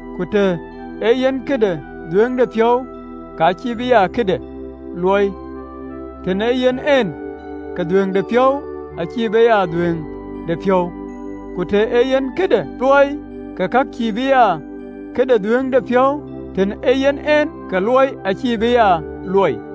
Ku të ee yen këde dhuëëŋdepiɔ̈u, ka cïï be ya këde luɔi, tën ee yen en, ke dhuëëŋdepiɔ̈u acïï be ya dhuëëŋdepiɔ̈u, ku të ee yen këde luɔi, ka cïï be ya këde dhuëëŋdepiɔ̈u, tën ee yen en, ke luɔi acïï be ya luɔi.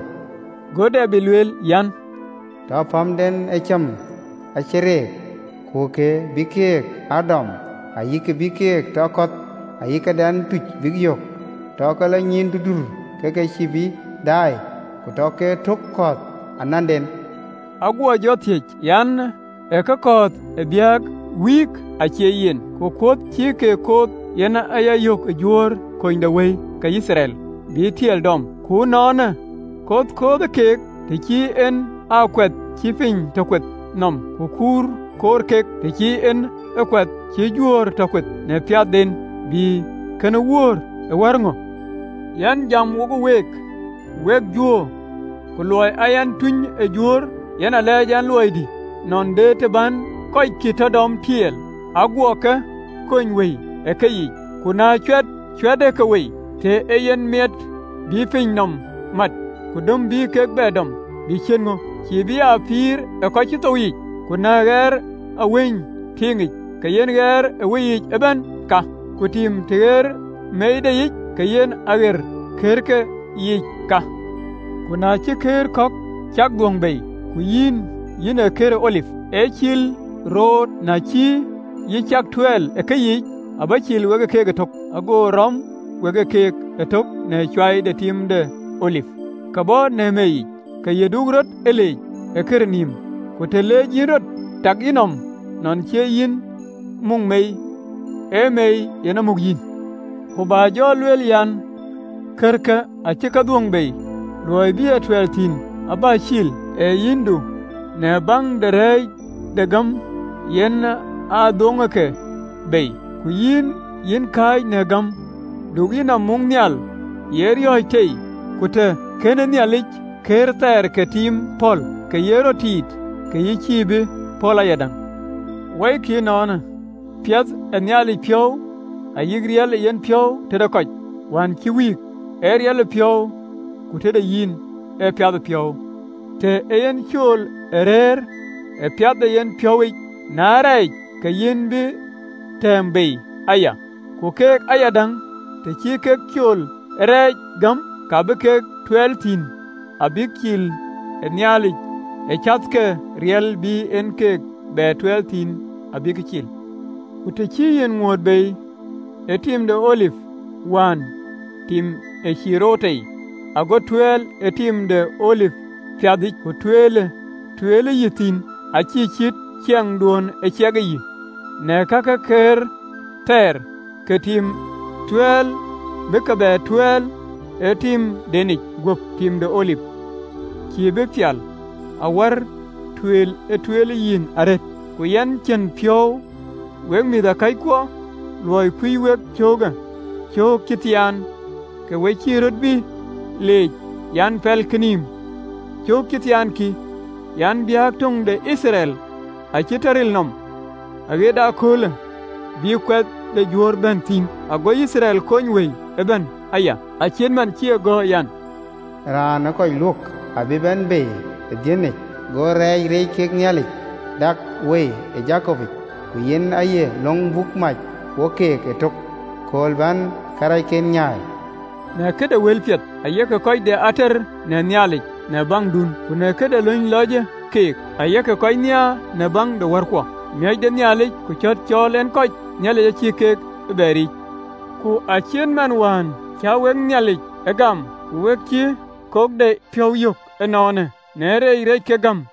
(LXX). Go Debid lueel an, “Tɔ pamdɛn ë cäm ee wïn ëdɛ̈p, ku ye kë bï keek aa dɔm, Ayï kë bï keek tɔ kɔ̈th, ayï këdɛn tuc bïk yök! Tɔ ke lɔ nyïïn durdur, ke ke cïï bï daai, Ku tɔ ke tot kekɔ̈ɔ̈th ananden.” Aguɔ jɔ thiëëc an: ë ke kɔ̈th abïk wïïk? Acie yen! Ku kɔ̈th cï kek kɔ̈th, yen a yökë Juöör kunydewëi, ke Yithriɛl bï ë tiɛɛl dɔm. Ku ënɔɔnë, kɔ̈th kɔ̈th kek, të cï en aa kuɛth cï piny tɔ kueth nɔm, ku kuur koor kek, të cï en aa kuɛth cï Juöör tɔ kueth, na piathden, bï kënë wöör ë wär ŋö? Yɛn jam wo week, wek Juöör, ku luɔi aa yɛn tuny ë Juöör, yen alɛɛc ɛn luɔidï. Nɔn de të bän kɔckiën ke Judai tɔ dɔm tiɛɛl, aguɔ kɔ̈k kony wëi ë keyiic. Ku na cuɛt cuɛtë ke wei, të ee yen mɛ̈ɛ̈t bï piny nɔm määt, ku döm bï ke bɛ dɔm, bï ciët ŋö, cïï bï aa pïïr ë kɔc cï thou yiic? Ku na ɣer awany tueŋic, ka yen ɣɛɛr ë awacic ëbɛ̈n ka, tim, të ɣeerë meideyic, ka yen ɣɛɛr ë kërke yiic ka. Ku na cï këër kɔ̈k cak dhuöŋ bei, ku yïn, yïn ee këër ë olip ë cil roor, na cï yï cak tuɛɛl ë keyiic, abä cil we keek ëtök, ago rɔm we keek ëtök në cuai de tim de olip, kë bɔ̈ në meei yic. Ke yï cïï rɔt ee leec në kër nïïm. Ku të leec yïn rɔt, tak yïnɔm nɔn cie yïn ë muk meei, ee meei yen aa muk yïn. Ku bä jɔ lueel an, “Kërkë acï ke dhuöŋ bei, luɔi bï a tuɛɛl thïn, abä cil. Ee yicdu, në baŋ de reec de gäm yen a dhuŋë ke bei, ku yïn, yïn kääc në gäm. Du yïnɔm muk nhial, ye riɔ̈ɔ̈c tei. Ku të kën Nhialic këër thɛɛr ke tim pɔ̈l, ke ye rɔt tiit, ke yï cïï bï pɔ̈l ayadäŋ. Wɔikï ënɔɔnë, piath ë Nhialic piɔ̈u ayï riɛl ë yenpiɔ̈u: tëde kɔc wään cï wïïk, ee riɛlëpiɔ̈u, ku tëde yïn ee piathëpiɔ̈u, të ee yïn cool ë rëër ë piath de yenpiɔ̈u, na rɛɛcë, ke yïn bï tɛ̈ɛ̈m bei aya. Ku keek ayadäŋ, të cïï kek ee cool ë reec gäm, ka bï ke tuɛɛl thïn abïk cil, Nhialic acath ke riɛl bï en ke bɛ tuɛɛl thïn abïk cil. Ku të cï yï ŋuööt bei ë tim de olip wään, tim ë cil roor tei, ago tuɛɛl ë tim de olip piɛthic, ku tueel tueelë yï thïn acïï cït ciɛɛŋduön ë ciɛkë yï, na kakë kek kër thɛɛr ke tim, tueel bï ke bɛ tuɛɛl ë timdenic guöp tim de olip, cïï bï pial awär tueel ë tueelë yïn arëët? Ku yɛn cïn piɔ̈u, wek mïthëkɔckuɔ, luɔi kuöc wek ee cöökë, cöök cï moony, ke we cïï röt bï leec an, pɛlkï nïïm. Cöök cï moony, kï an, biäk töŋ de Yithriɛl acï tɔ ril nɔm, aɣet kööl bï kuɛth de juöör bɛ̈n thïn. (LXX). Ago Yithriɛl kony wëi ëbɛ̈n aya, acït man cï e gɔ̈ɔ̈r an, “Raan ë kɔc luök abï bɛ̈n bei ë Dhiɔnic, Go reec reec kek Nhialic dak wei ë käu de Jakopic. (LXX). Ku yen aye löŋ buk mac wo keek ëtök, Kööl bän karɛcken nyaai.” Në këde wëlpiɛth, ayek kɔc de ater në Nhialic në baŋdun, ku në këde löny lɔcë keek, ayek kɔc nhiaar në löŋ de wärkuɔ. Miɔ̈c de Nhialic ku cɔ̈l cɔɔl en kɔc, Nhialic acïï keek ee bɛ riic. Ku acït man wään cä wek Nhialic ee gam, ku we cï kokdepiɔ̈u yök ënɔɔnë në rɛɛc reec kek gäm.